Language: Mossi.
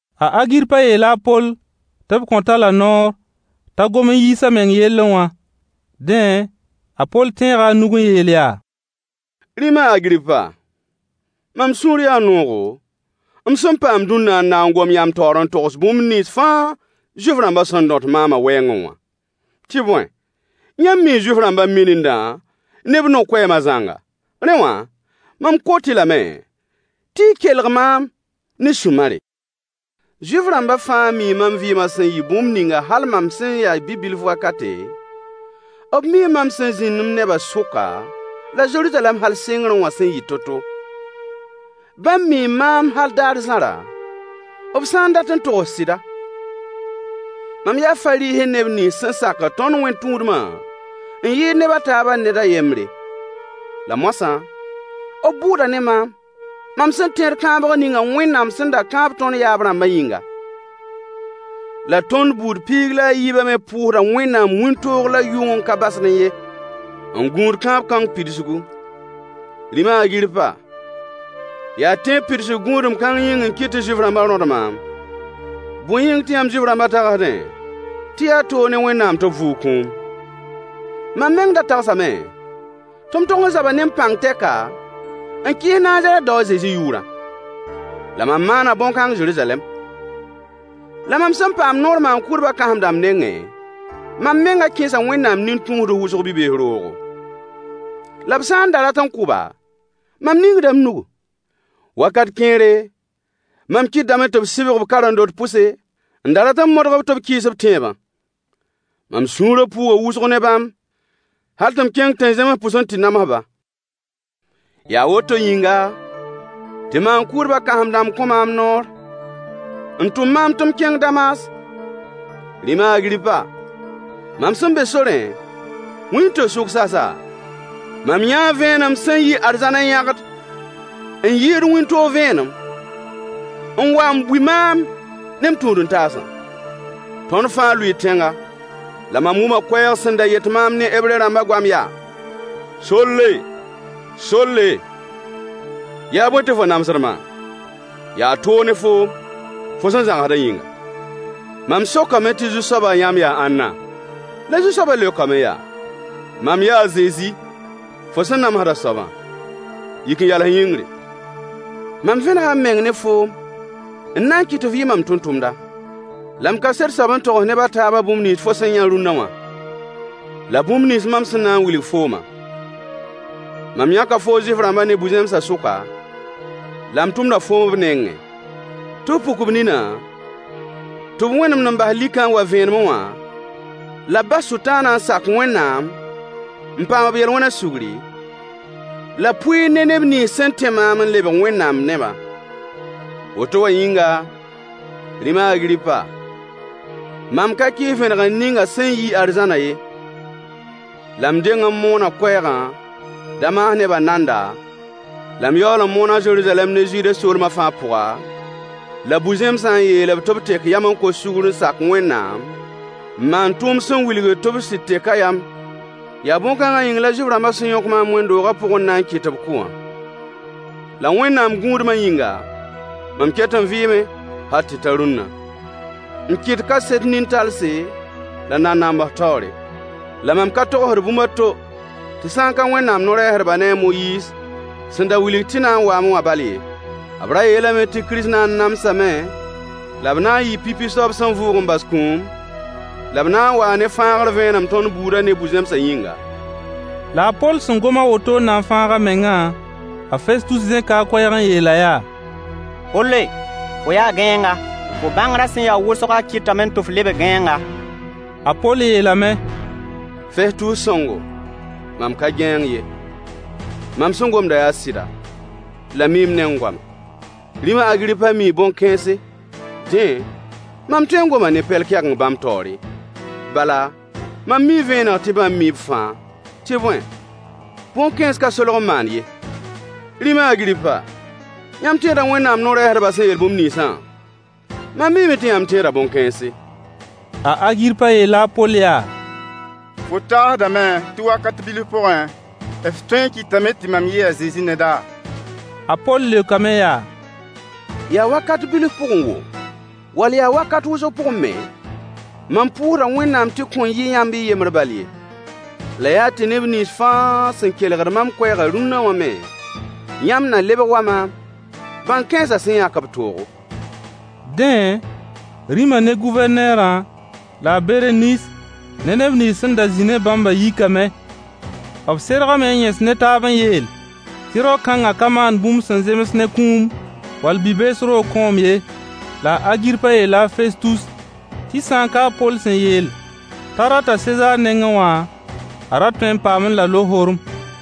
A Agirpa yeela a Poll tɩ b kõt-a-la noor t'a gom n yiis a meng yellẽ wã. Dẽ, a Poll tẽega a nug n yeel yaa: Rĩm a Agirpa, mam sũur yaa noogo m sẽn paam dũnna n na n gom yãmb taoor n togs bũmb nins fãa Zuif-rãmba sẽn dõt maama wɛɛngẽ wã. Tɩ bõe, yãmb mii Zuif-rãmba minindã ne b no-koɛɛma zãnga. Rẽ wã, mam kot-y lame tɩ y kelg maam ne sũ-mare. Zuif-rãmba fãa mii mam vɩɩmã sẽn yɩ bũmb ninga hal mam sẽn ya bi-bilf wakate, b mii mam sẽn zĩnd m nebã sʋka la Zeruzalɛm hal sɩngrẽ wã sẽn yɩ to-to. Bãmb mii maam hal daar zãra, b sã n dat n togs sɩda. Mam yaa Fariisẽ neb nins sẽn sakd tõnd wẽn-tũudma n yɩɩd neb a taaba ned a yembre. La moasã, b bʋʋda ne maam, mam sẽn tẽed kãabg ninga Wẽnnaam sẽn da kãab tõnd yaab-rãmbã yĩnga. La tõnd buud piig la a yiibã me pʋʋsda Wẽnnaam wĩntoog la yʋng n ka basdẽ ye, n gũud kãab-kãng pidsgu. Rĩm a Agirpa, yaa tẽeb pidsg gũudem kãng yĩng n kɩt tɩ Zuif-rãmbã rõd maam. Bõe yĩng tɩ yãmb Zuif-rãmbã tagsdẽ tɩ yaa toog ne Wẽnnaam tɩ b vʋʋg kũum? Mam meng da tagsame tɩ m tog n zaba ne m pãng tɛka n kɩɩs Nazarɛt dao a Zezi yʋʋrã. La mam maana bõn-kãng Zeruzalɛm. La mam sẽn paama noor maan-kʋʋdbã kãsem-dãmb nengẽ, mam menga kẽesa Wẽnnaam nin-tũusds wʋsg bi-bees roogo. La b sã n da rat n kʋ-ba, mam ningda m nugu. Wakat kẽere, mam kɩtedame tɩ b sɩbg-b karen-dot pʋse, n da rat n modg-b tɩ b kɩɩs b tẽebã. Mam sũurã pʋʋga wʋsg ne bãmb hal tɩ m kẽng tẽn-zẽms pʋs n tɩ nams-ba. Yaa woto yĩnga, tɩ maan-kʋʋdbã kãsem-dãmb kõ maam noor n tʋm maam tɩ m kẽng Damas. Rĩm a Agirpa, mam sẽn be sorẽ, wĩnto-sʋk sasa, mam yãa vẽenem sẽn yi arzãn n yãgd n yɩɩd wĩntoog vẽenem, n wa n bui maam ne m tũud-n-taasã. Tõnd fãa lʋɩɩ tẽnga, la mam wʋma koɛɛg sẽn da yet maam ne Hebre-rãmbã goam yaa: “Solle, Solle, yaa bõe tɩ fo namsd maam? Yaa toog ne foom, fo sẽn zãgsda yĩnga.” Mam sokame tɩ Zu-soaba yãmb yaa ãnna? La Zu-soabã leokame yaa: “Mam yaa a Zezi, fo sẽn namsd a soabã. Yik n yals yĩngri. Mam vẽnega m meng ne foom n na n kɩt tɩ f yɩ mam tʋmtʋmda, la m kaset soab n togs neb a taabã bũmb nins fo sẽn yã rũnna wã, la bũmb nins mam sẽn na n wilg fooma. Mam yãka foo Zuif-rãmbã ne bu-zẽmsã sʋka, la m tʋmda foom b nengẽ, tɩ f puk b nina tɩ b wẽnemd n bas likã n wa vẽenemẽ wã la b bas Sʋtãana n sak Wẽnnaam n paam b yel-wẽna sugri, la pʋɩɩr ne neb nins sẽn tẽ maam n lebg Wẽnnaam nebã.” Woto wã yĩnga, Rĩm a Agirpa, mam ka kɩɩs vẽnegr ninga sẽn yi arzãna ye. La m deng n moona koɛɛgã Damas nebã nanda la m yaool n moon-a Zeruzalɛm ne Zude soolma fãa pʋga, la bu-zẽmsã n yeel-b tɩ b tek yam n kos sugr n sak Wẽnnaam n maan tʋʋm sẽn wilgd tɩ b sɩd teka yam. Yaa bõn-kãnga yĩng la Zuif-rãmbã sẽn yõk maam wẽnd-doogã pʋg n na n kɩt tɩ b kʋ wã. La Wẽnnaam gũudmã yĩnga, mam ket n vɩɩme hal tɩ ta rũnna, n kɩt kaset nin-talse la nanams taoore. La mam ka togsd bũmb a to tɩ sã n ka Wẽnnaam no-rɛɛsdbã ne a Moyiis sẽn da wilg tɩ na n waame wã bal ye. B ra yeelame tɩ Kirist na n namsame la b na n yɩɩ pipi soab sẽn vʋʋg n bas kũum, la b na n waa ne fãagre vẽenem tõnd buudã ne bu-zẽmsã yĩnga. La a Poll sẽn gom a woto n na n fãag a mengã, a Festus zẽka a koɛɛg n yeel-a yaa: Polle! Fo yaa gãeenga. Fo bãngrã sẽn ya wʋsgã kɩtame tɩ f lebg gãeenga. A Poll yeelame: Festus sõngo, mam ka gãeeng ye. Mam sẽn gomda yaa sɩda la mi-m-neng goama. Rĩm a Agirpa mii bõn-kãense, dẽ mam tõe n goma ne pɛl-kɛgeng bãmb taoore, bala mam mii vẽeneg tɩ bãmb mii b fãa, tɩ bõe bõn-kãens ka solg n maan ye. Rĩm a Agirpa, yãmb tẽeda Wẽnnaam no-rɛɛsdbã sẽn yeel bũmb ninsã? Mam miime tɩ yãmb tẽeda bõn-kãense. A Agirpa yeela a Poll yaa: Fo tagsdame tɩ wakate bilf pʋgẽ, f tõe n kɩtame tɩ mam yɩɩ a Zezi neda? A Poll leokame yaa: Yaa wakat bilf pʋgẽ woo, wall yaa wakat wʋsg pʋgẽ me, mam pʋʋsda Wẽnnaam tɩ kõn yɩ yãmb y yembr bal ye. La yaa tɩ neb nins fãa sẽn kelgd mam koɛɛgã dũnna wã me, yãmb na lebg wa maam, bãn-kãensã sẽn yãk b toogo. Dẽ, rĩma ne Gʋvɛrneera la a Bereniis ne neb nins sẽn da zĩ ne bãmbã yikame. B sergame n yẽs ne taab n yeel tɩ rao-kãngã ka maan bũmb sẽn zems ne kũum, wall bi-bees roog kõom ye. La a Agirpa yeela a Festus tɩ sã n ka a Poll sẽn yeel t'a rata Sezaar nengẽ wã, a ra tõe n paamẽ la lohorem.